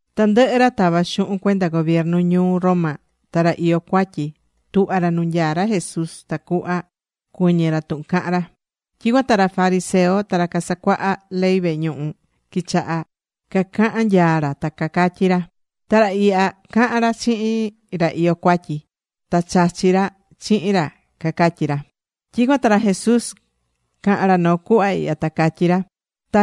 Tandɨhɨ ra tavá xuhun cuenda gobiernu ñuu Roma, ta ra iyó cuatyi, tuhva̱ ra nu nyaá ra Jesús, tacuhva cuɨñɨ ra tuhun cahán ra. Tyicuan ta ra fariseo ta ra casacuaha ley vehe ñuhu quichaha cacahan nyaa ra, ta cacatyí ra: ―Ra ihya, cahán ra chihin ra iyó cuatyi. Ta chachí ra chihin ra ―cacatyí ra. Tyicuan ta ra Jesús caha̱n ra noo cuhva ihya, ta catyí ra: ―Ta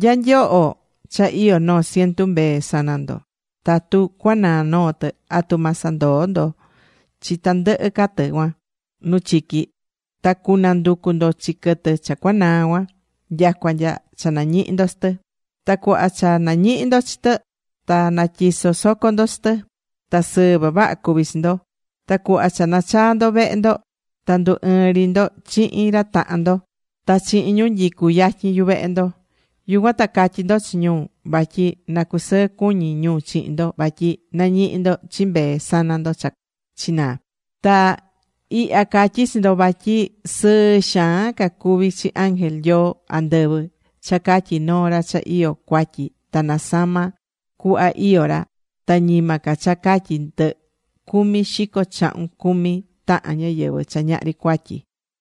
nya nyoho cha iyó noo cientu mbee sana ndo, tatu cuanaa noo tɨ, ¿atu ma sandoo ndo chi tandɨhɨ ca tɨ cuan nu chiqui. Ta cunanducu ndo chi quɨtɨ cha cuanaa cuan, nyacua nya cha nañihi ndo chi tɨ? Ta cuhva cha nañihi ndo chi tɨ, ta natyiso soco ndo chi tɨ. Ta sɨɨ vavaha cuví chi ndo. Ta cuhva cha nachaa ndo vehe ndo, ta ndu ɨɨn ri ndo chihin ra tahan ndo ta chihin ñu nyicú yatyin yuvehe ndo, yucuan ta catyi ndo chi ñu vatyi na cusɨɨ cuñi ñu chihin ndo vatyi nañihi̱ ndo chi mbee sana ndo cha chinaa̱. Ta ihya catyí chi ndo, vatyi sɨɨ xaan ca cuvi chi ángel Nyoo andɨvɨ cha catyi noo ra cha iyó cuatyi ta nasama cuhva iyó ra, ta ñima ca cha catyi ndɨ cumi xico chahun cumi tahan ñáyɨvɨ cha ñahri cuatyi.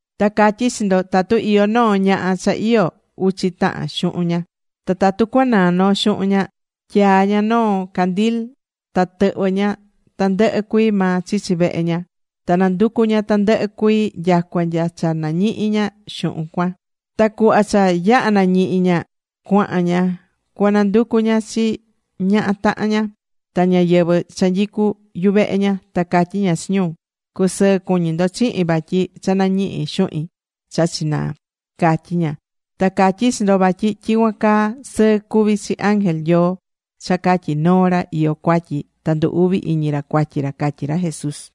’Ta catyí chi ndo, tatu iyó noo ñaha cha iyó uchi tahan xuhun ña, ta tatu cuanaa noo xuhun ña, tyaa ña noo candil. Ta tɨhvɨ ña tandɨhɨ cuii maa chichi vehe ña. Ta nanducu ña tandɨhɨ cuii nyacua nya cha nañihi ña xuhun cuan. Ta cuhva cha yaha̱ nañihi̱ ña, cuahan ña cua nanducu ña chi ñaha tahan ña, ta ñáyɨvɨ cha nyicú yuvehe ña, ta catyi ña chi ñu: “Cu̱sɨɨ cuñi ndo chihin vatyi cha nañihi̱ xuhin cha chinaa”, catyí ña. Ta catyí chi ndo vatyi tyicuan caa sɨɨ cuví chi ángel Nyoo cha catyi noo ra iyó cuatyi ta ndu uvi iñi ra cuatyi ra ―catyí ra Jesús.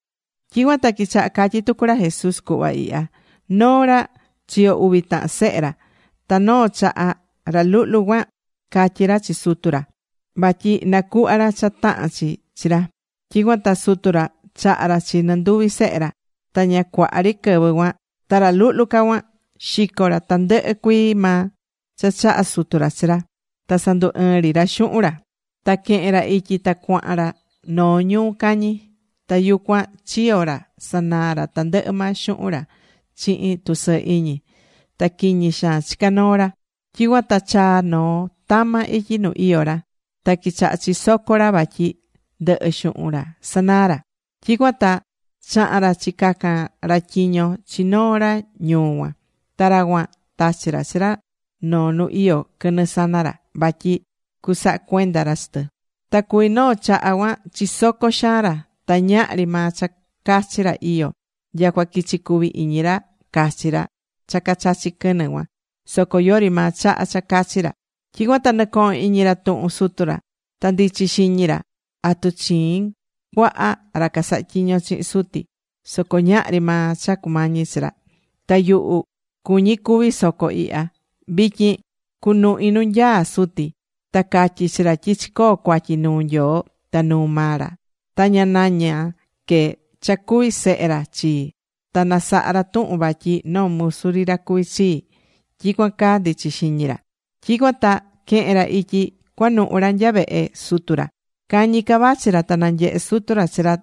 Tyicuan ta quichaha catyí tucu ra Jesús cuhva ihya: ―Noo ra, chiyo̱ uvi tahan sehe ra. Ta noo chaha, ra luhlu ca cuan catyí ra chi sutu ra vatyi nacuhva ra cha tahán chi chi ra. Tyicuan ta sutu ra chaha̱ ra chi nɨnduvi sehe ra. Ta ña cuaha ri quɨvɨ cuan ta ra luhlu ca cuan xico̱ ra tandɨhɨ cuii maa cha chaha̱ sutu ra chi ra. Ta sandu ɨɨn ri ra xuhun ra, ta quehe̱n ra ityi ta cuahan ra noo ñuu cañi. Ta yucuan chiyo̱ ra, sanaa̱ ra tandɨhɨ maa xuhun ra chihin tusɨɨ iñi. Ta quiñi xaan chicá noo ra. Tyicuan ta chaa̱ noo tama ityi nu iyó ra. Ta quichaha chisoco ra vatyi ndɨhɨ xuhun ra sanaa̱ ra. Tyicuan ta chaha̱n ra chicaca̱n ra tyiño chi noo ra ñuu cuan. Ta ra cuan tachi̱ ra chi ra noo nu iyó quɨnɨ sana ra, vatyi cusaha cuenda ra chi tɨ. Ta cuví noo chaha cuan chisoco xaan ra. Ta ñahri maa cha cachi ra iyó, nyacua quichi cuvi iñi ra cachi ra cha cachachí quɨnɨ cuan soco yori maa chaha cha cachi ra. Tyicuan ta nɨcohon iñi ra tuhun sutu ra. Ta ndichi xiñi ra: “¿Atu chiin cuaha ra casahá tyiño chihin suti? Soco ñahri maa cha cumañi chi ra. Ta yuhu cuñí cúvi soco ihya. Vityin cunuhin nu nyaá suti. Ta catyi chi ra tyi chicoo̱ cuatyi nuu Nyoo ta nuu maa ra. Ta ña naña que cha cuvi sehe ra chii, ta na saha ra tuhun vatyi noo musu ri ra cuví chii.” Tyicuan caa ndichi xiñi ra. ’Tyicuan ta quehe̱n ra ityi cuanuhu ra nya vehe sutu ra. Cañi ca vachi ra ta nanyehe̱ sutu ra chi ra,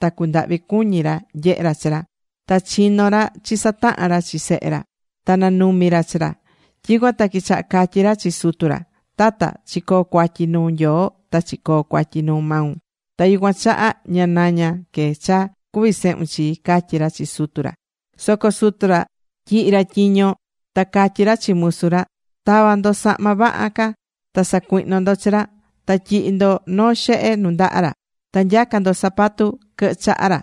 ta cundahvi̱ cuñi ra nyehe ra chi ra. Ta chino̱ ra chisataha̱n ra chi sehe ra. Ta nanumi̱ ra chi ra. Tyicuan ta quichaha catyí ra chi sutu ra: “Tata, chicoo̱ cuatyi nuu Nyoo ta chicoo̱ cuatyi nu maun. Ta yucuan chaha ña naña que cha cuví sehun chii”, catyí ra chi sutu ra. Soco sutu ra tyihi ra tyiño, ta catyí ra chi musu ra: “Ta̱va ndo sahma vaha ca ta sa̱cuihno ndo chi ra. Ta tyi̱hi ndo noo xehe nundaha ra. Ta nya̱ca ndo zapato quɨhɨ chaha ra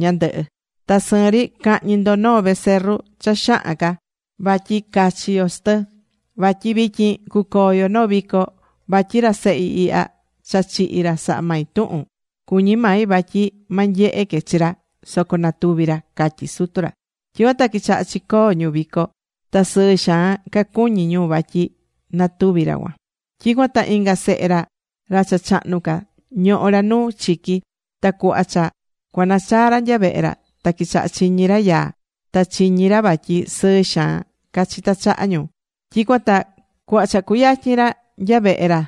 ñandɨhɨ. Ta sɨɨn ri ca̱hñi ndo noo becerru cha xahan ca, vatyi cachi yo chi tɨ. Vatyi vityin cucoo yo noo vico. Vatyi ra sehi ihya cha chihi̱ ra saha̱ mai tuhun. Cuñi̱ mai vatyi ma nyehe que chi ra, soco natuvi̱ ra”, catyí sutu ra. Tyicuan ta quichaha chicoo ñu vico. Ta sɨɨ xaan cacuñí ñu vatyi natuvi̱ ra cuan. ’Tyicuan ta inga sehe ra, ra cha chahnu ca, ñohó ra nu chiqui. Ta cuhva cha cuanachaa ra nya vehe ra, ta quichaha chiñi̱ ra yaa. Ta chiñí ra vatyi sɨɨ xaan cachitá chaha ñu. Tyicuan ta cuhva cha cuyatyin ra nya vehe ra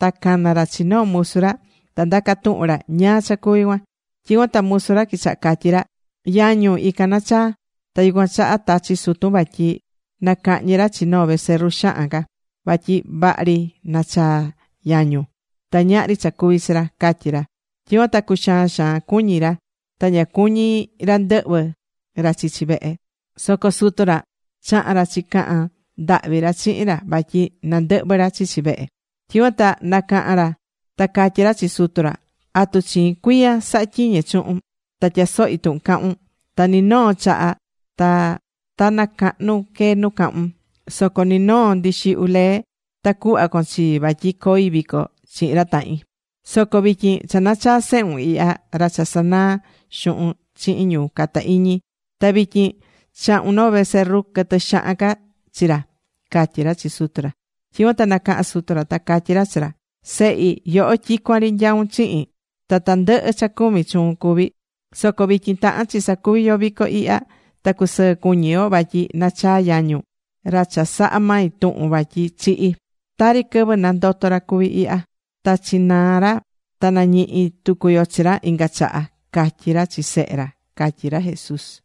ta cana̱ ra chi noo musu ra. Ta ndaca tuhun ra ñáá cha cuví cuan. Tyicuan ta musu ra quichaha catyí ra: “Yañun, ican nachaa̱. Ta yucuan chaha tachi̱ sutun vatyi na cahñi ra chi noo becerru xahan ca. Vatyi vaha ri nachaa yañun, ta ñahri cha cuvi̱ chi ra”, catyí ra. Tyicuan ta cuxaan xaan cuñí ra. Ta ña cuñí ra ndɨhvɨ ra chichi vehe. Soco sutu ra chaha̱n ra chicaha̱n ndahvi ra chihin ra, vatyi na ndɨhvɨ ra chichi vehe. Tyicuan ta nacaha̱n ra ta catyí ra chi sutu ra: “¿Atu chiin cuiya sahá tyiñe chuhun? Ta tyasohí tuhun cahún. Ta ni noo chaha ta ta nacahnu que nu cahún. Soco ni noo ndixihyu lee ta cuhva con chii vatyi coi vico chihin ra tahin. Soco vityin cha nachaa̱ sehun ihya, ra cha sanaa̱ xuhun chihin ñu cata iñi. Ta vityin chahu̱n noo becerro quɨtɨ xahan ca chi ra”, catyí ra chi sutu ra. Tyicuan ta nacaha̱n sutu ra ta catyí ra chi ra: “Sehi, yoho tyicuan ri nyaún chihin. Ta tandɨhɨ cha cumi, chuun cuví. Soco vityin tahán chi sacuvi yo vico ihya. Ta cusɨɨ cuñí yo. Vatyi nachaa̱ yañun, ra cha saha̱ mai tuhun vatyi chihi̱. Tari quɨvɨ nandoto̱ ra cuví ihya. Ta chinaa̱ ra, ta nañihi̱ tucu yo chi ra inga chaha”, catyí ra chi sehe ra ―catyí ra Jesús.